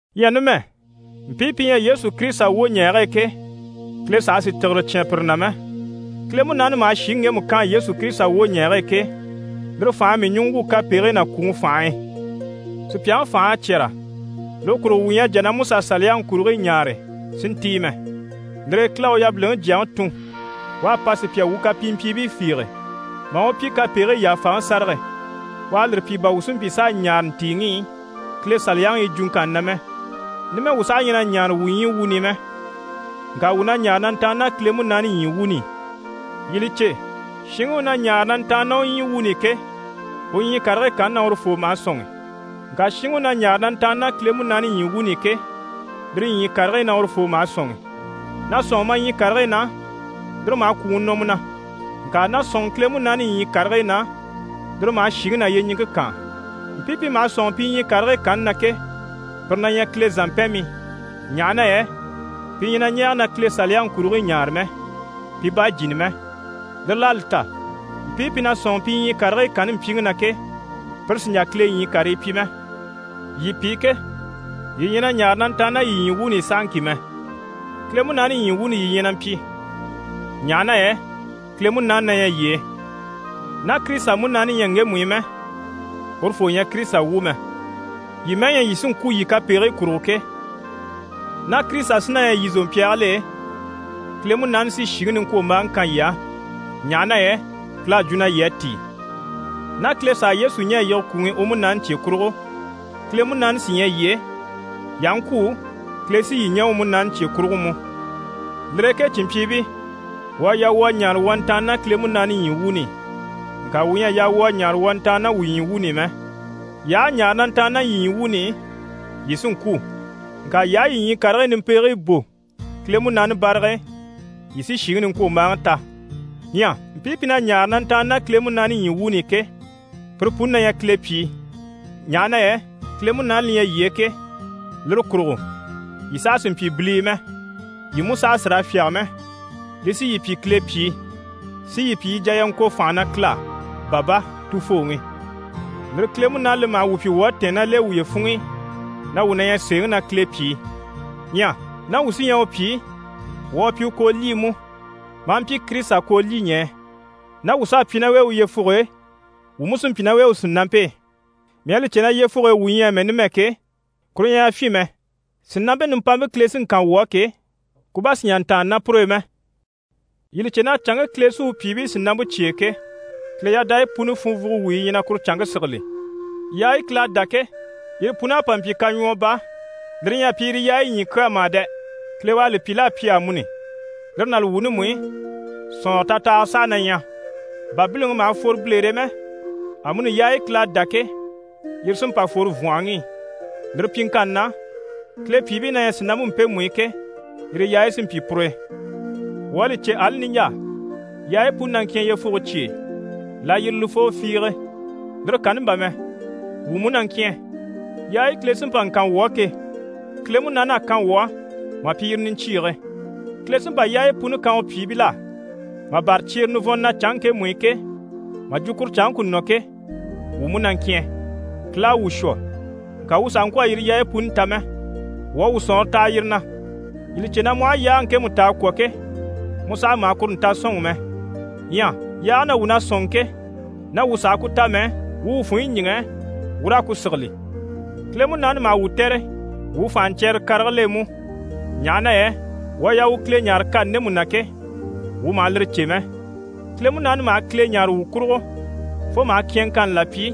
Ɲyɛ numɛ, mpii pi ɲyɛ Yesu Kirisita wwoɲɛɛge e ke, Kile saha sì tìgire cyán pire na mɛ. Kile Munaani maha shìŋi ŋgemu kaan Yesu Kirisita wwoɲɛɛge e ke, lire fành'à mii ɲùŋɔ wwû kapegigii ná kwùŋi fànhe e. Sùpyaŋi fành'à cyɛ́rɛ, lire kurugo wuu ɲyɛ a jà na MusaSaliyaŋi kurigii ɲaare si ntíi mɛ. Lire e Kile à u yabiliŋi Jyaŋi tun, u à pa sùpya wuu kapimpyiibii fiige, maa u pyi kapegigii yàfaŋi sárage. U à lire pyi, bà wuu si mpyi s'a ɲaare ntìiŋi i Kile Saliyaŋi yi jwuŋkanni na mɛ. Numɛ, wuu saha ɲyɛ na ɲaare wuu ɲyii wuuni i mɛ, ŋka wuu na ɲaare na ntàanni ná Kile Munaani ɲyii wuuni i. Yii li cè, shinŋi u na ɲaare na ntàanni ná u ɲyii wuuni i ke, u ɲyii karigii kanni na urufoo maha sɔ̂nŋi. Ŋka shinŋi u na ɲaare na ntàanni ná Kile Munaani ɲyii wuuni i ke, lire ɲyii karigii na urufoo maha sɔ̂nŋi. Na sɔ̂nŋi ma ɲyii karigii na, lire maha kwùŋi nɔ mu na, ŋka na sɔ̂nŋi Kile Munaani ɲyii karigii na, lire maha shìŋi ná yyeɲiŋke kaan. Mpii pi maha sɔ̂nŋi pi ɲyii karigii kanni na ke, pire na ɲyɛ Kile zàmpɛnmii. Ɲaha na yɛ pi ɲyɛ na ɲɛɛge na Kile Saliyaŋi kurigii ɲaare mɛ, pi bá jìni mɛ. Lire l'à li ta, mpii pi na sɔ̂nŋi pi ɲyii karigii kanni mpyiŋi na ke, pire sì n‑jà Kile ɲyii karii pyi mɛ. Yii pi ke, yii ɲyɛ na ɲaare na ntàanni ná yii ɲyii wuuni i sahaŋki mɛ, Kile Munaani ɲyii wuuni yii ɲyɛ na mpyi, ɲaha na yɛ Kile Munaani na ɲyɛ yii e. Ná Kirisita Munaani ɲyɛ ŋgemu i mɛ, urufoo ɲyɛ Kirisita wu mɛ. Yii mɛ́ɛ ɲyɛ yii sí n‑kwû yii kapegigii kurugo ke, ná Kirisita sí na ɲyɛ yii zòmpyaagil'e, Kile Munaani sí shìŋi niŋkwombaaŋi kan yii á, ɲaha na yɛ Kile à jwo na yii à tíi. Ná Kile s'à Yesu ɲɛ̀ a yige kwùŋi i u Munaani cye kurugo, Kile Munaani sí ɲyɛ yii e, yii aha ŋkwû, Kile sí yii ɲɛ̀ u Munaani cye kurugo mú. Lire e ke cìnmpyiibii, wuu à yaa wuu a ɲaare wuu a ntàanni ná Kile Munaani ɲyii wuuni i, ŋka wuu ɲyɛ a yaa wuu a ɲaare wuu a ntàanni ná wuu ɲyii wuuni i mɛ. Yii aha a ɲaare na ntàanni ná yii ɲyii wuuni i, yii sí n‑kwû, ŋka yii aha yii ɲyii karigii nimpegigii bò Kile Munaani barag'e, yii sí shìŋi niŋkwombaaŋi ta. Ɲyɛ mpii pi na ɲaare na ntàanni ná Kile Munaani ɲyii wuuni i ke, pire puni na ɲyɛ Kile pyìi. Ɲaha na yɛ Kile Munaani li ɲyɛ yii e ke, lire kurugo, yii saha sì n‑pyi bilii mɛ, yii mú saha sì raa fyáge mɛ. Li sí yii pyi Kile pyìi, si yii pyi yii jà yii a ŋko fànha na Kile á: «Baba, Tufooŋi!» Lire Kile Munaani li maha wuu pyi wuu à tɛ̀ɛn ná l'e wuye funŋ'i na wuu na ɲyɛ sèeŋi na Kile pyìi. Ɲyɛ ná wuu sí ɲyɛ u pyìi, wuu à pyi u koolyii mú, maa mpyi Kirisita koolyiɲɛɛ. Ná wuu s'à pyi ná u e u yyefuge e, wuu mú sí n‑pyi ná u e u sìnampe e. Mii à li cè na yyefuge e wuu ɲyɛ amɛ numɛ ke, kuru ɲyɛ yafyin mɛ, sìnampe nimpampe Kile sí n‑kan wuu á ke, ku bá sì n‑jà n‑tàanna ná pur'e mɛ. Yii li cè na canŋke Kile sí u pyìibii sìnampe cyêe ke, Kile yadayi puni funvwugo wuyi yi ɲyɛ na kuru canŋke sigili. Yaayi Kile à dá ke, yire pun'à pa mpyi kaɲwɔɔ baa. Lire ɲyɛ a pyi yire yaayi ɲyii kyaa mà dɛ! Kile u à li pyi l'à pyi amuni. Lire ná li wuuni mú i, sɔ̀nŋɔrɔ tatahaga saha na ɲyɛ. Bà biliŋi maha fworo bilere e mɛ, amuni yaayi Kile à dá ke, yire sí n‑pa n-fworo vwɔ̀nhɔŋi i. Lire pyiŋkanni na, Kile pyìibii na ɲyɛ sìnampe mpemu i ke, yire yaayi sí n‑pyi pur'e. Wuu à li cè, ali niɲjaa, yaayi puni na ŋkyɛ̀n yyefuge cye e, layirilifoo fiige. Lire kanni bà mɛ, wuu mú na ŋkyɛ̀n. Yaayi Kile sí n‑pa n‑kan wuu á ke, Kile Munaani à kan wuu á mà pyi yire niɲcyiige. Kile sí n‑pa yaayi puni kan u pyìibil'á mà bâra cyeere nivɔnnte na canŋke ŋkemu i ke, mà jwo kuru canŋke ku nɔ ke, wuu mú na ŋkyɛ̀n. Kile à wuu shwɔ, ŋka wuu sàha ŋkwɔ̀ a yire yaayi puni ta mɛ. Wuu à wuu sɔ̀nŋɔre taha yire na. Yii li cè na mu aha yaage ŋkemu ta a kwɔ̀ ke, mu sàha maha kuru nta sɔ̂nŋi mɛ. Ɲyɛ yaage na wuu na sɔ̂nŋi ke, ná wuu sàha ku ta mɛ, wuu wuu funɲyi ɲíŋɛ wuu raa ku sigili. Kile Munaani maha wuu tɛ̀re wuu fànhaɲcyɛrɛrɛ karigil'e mú. Ɲaha na yɛ wuu à yaa wuu Kile ɲáare kani ndemu na ke, wuu maha lire cè mɛ. Kile Munaani maha Kile ɲáare wuu kurugo fo maha kyɛ̀nŋkanni là pyi,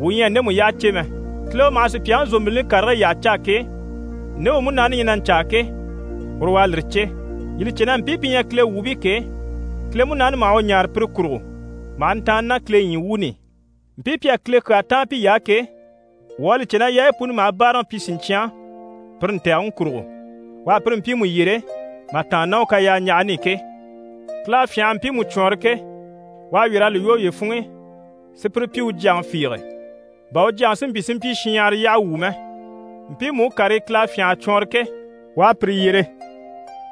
wuu ɲyɛ a ndemu yyaha cè mɛ. Kile u maha sùpyaŋi zòmbilini karigii yyaha caa ke, nde u Munaani ɲyɛ na ɲcaa ke, uru u à lire cè. Yii li cè na mpii pi ɲyɛ Kile wuubii ke, Kile Munaani maha u ɲáare pire kurugo maha ntàanna ná Kile ɲyii wuuni i. Mpii pi à Kile kyaa táan piy'á ke, wuu à li cè na yaayi puni maha báaraŋi pyi siɲcyan pire ntɛ̀gɛŋi kurugo, u à pire mpiimu yyere mà tàanna ná u kayaaɲjahani i ke. Kile à fyânha a mpiimu cwɔɔnrɔ ke, u à wyɛ̀r'a li lwɔ́ uye funŋ'i, si pire pyi u Jyaŋi fiige, bà u Jyaŋi si mpyi si mpyi shinɲyahara yyaha wu mɛ. Mpiimu u karii Kile à fyânha a cwɔɔnrɔ ke, u à pire yyere.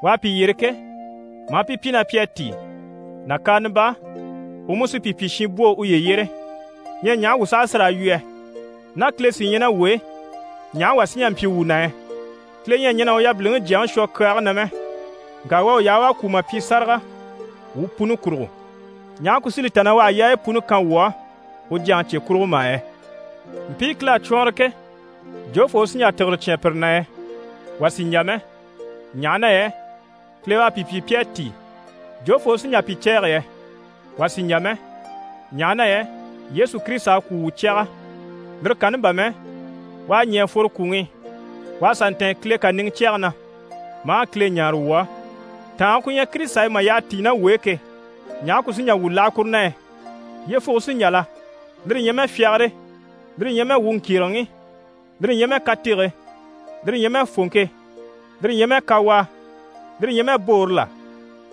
U à pi yyere ke, maa pi pyi na pi à tíi. Nàkaana baa, u mú sí pi pyi shinbwoo uye yyére. Ɲyɛ ɲaha wuu saha sí raa yu yɛ? Ná Kile sí ɲyɛ ná wuu e, ɲaha wà sí n‑jà n‑pyi wuu na yɛ? Kile ɲyɛ a ɲɛn'a u yabiliŋi Jyaŋi shwɔ kyaage na mɛ, ŋka u à u yaha u à kwû mà pyi sáraga wuu puni kurugo, ɲaha ku sí li ta na u àha yaayi puni kan wuu á u Jyaŋi cye kurugo mà yɛ? Mpii Kile à cwɔɔnrɔ ke, jofoo u sí n‑jà tìgire cyán pire na yɛ? Wà sì n‑jà mɛ, ɲaha na yɛ Kile u à pi pyi pi à tíi. Jofoo u sí n‑jà pi cɛ̂ɛgɛ yɛ? Wà sì n‑jà mɛ, ɲaha na yɛ Yesu Kirisita à kwû wuu cyaga, lire kanni bà mɛ, u à ɲɛ̀ a fworo kwùŋi i, u à sà ntɛ̀ɛn Kile kàniŋɛ cyɛge na, maa Kile ɲáare wuu á. Tàange ku ɲyɛ Kirisita e mà yyaha tíi ná wuu e ke, ɲaha ku sí n‑jà wuu láha kuru na yɛ? Yyefuge sí n‑jà la? Lire ɲyɛ mɛ fyagare, lire ɲyɛ mɛ wuu ŋkyèregeŋi, lire ɲyɛ mɛ katege, lire ɲyɛ mɛ fòŋke, lire ɲyɛ mɛ kawaa, lire ɲyɛ mɛ boore la?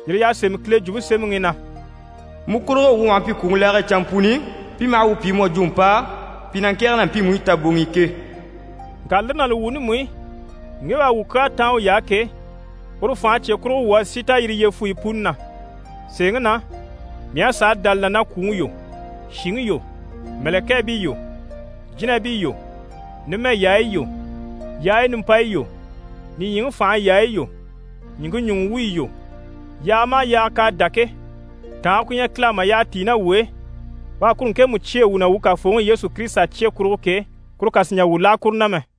Yire y'à sémɛ Kile Jwumpe Semɛŋi i na: «Mu kurugo, wuu maha mpyi kwùŋi laage e canmpuni, pi maha wuu pyi mu à jwo mpàa, pi na ŋkɛ̀ɛge ná mpiimu i taboŋ'i ke.» Ŋka lire ná li wuuni mú i, ŋge u à wuu kyaa táan uy'á ke, uru fànhe cye kurugo, wuu à sí ta yire yyefuyi puni na. Sèeŋi na, mii à sàa dá li na na kwùŋi yo, shìŋi yo, mɛ̀lɛkɛɛbii yo, jínabii yo, numɛ yaayi yo, yaayi nimpayi yo, nìɲyiŋi fànhe yaayi yo, ɲìŋke ɲùŋɔ wuyi yo, yaaga maha yaaga k'à dá ke, tàange ku ɲyɛ Kile á mà yyaha tíi ná wuu e, u à kuru ŋkemu cyêe wuu na wuu Kafooŋi Yesu Kirisita cye kurugo ke, kuru kà sì n‑jà wuu láha kuru na mɛ.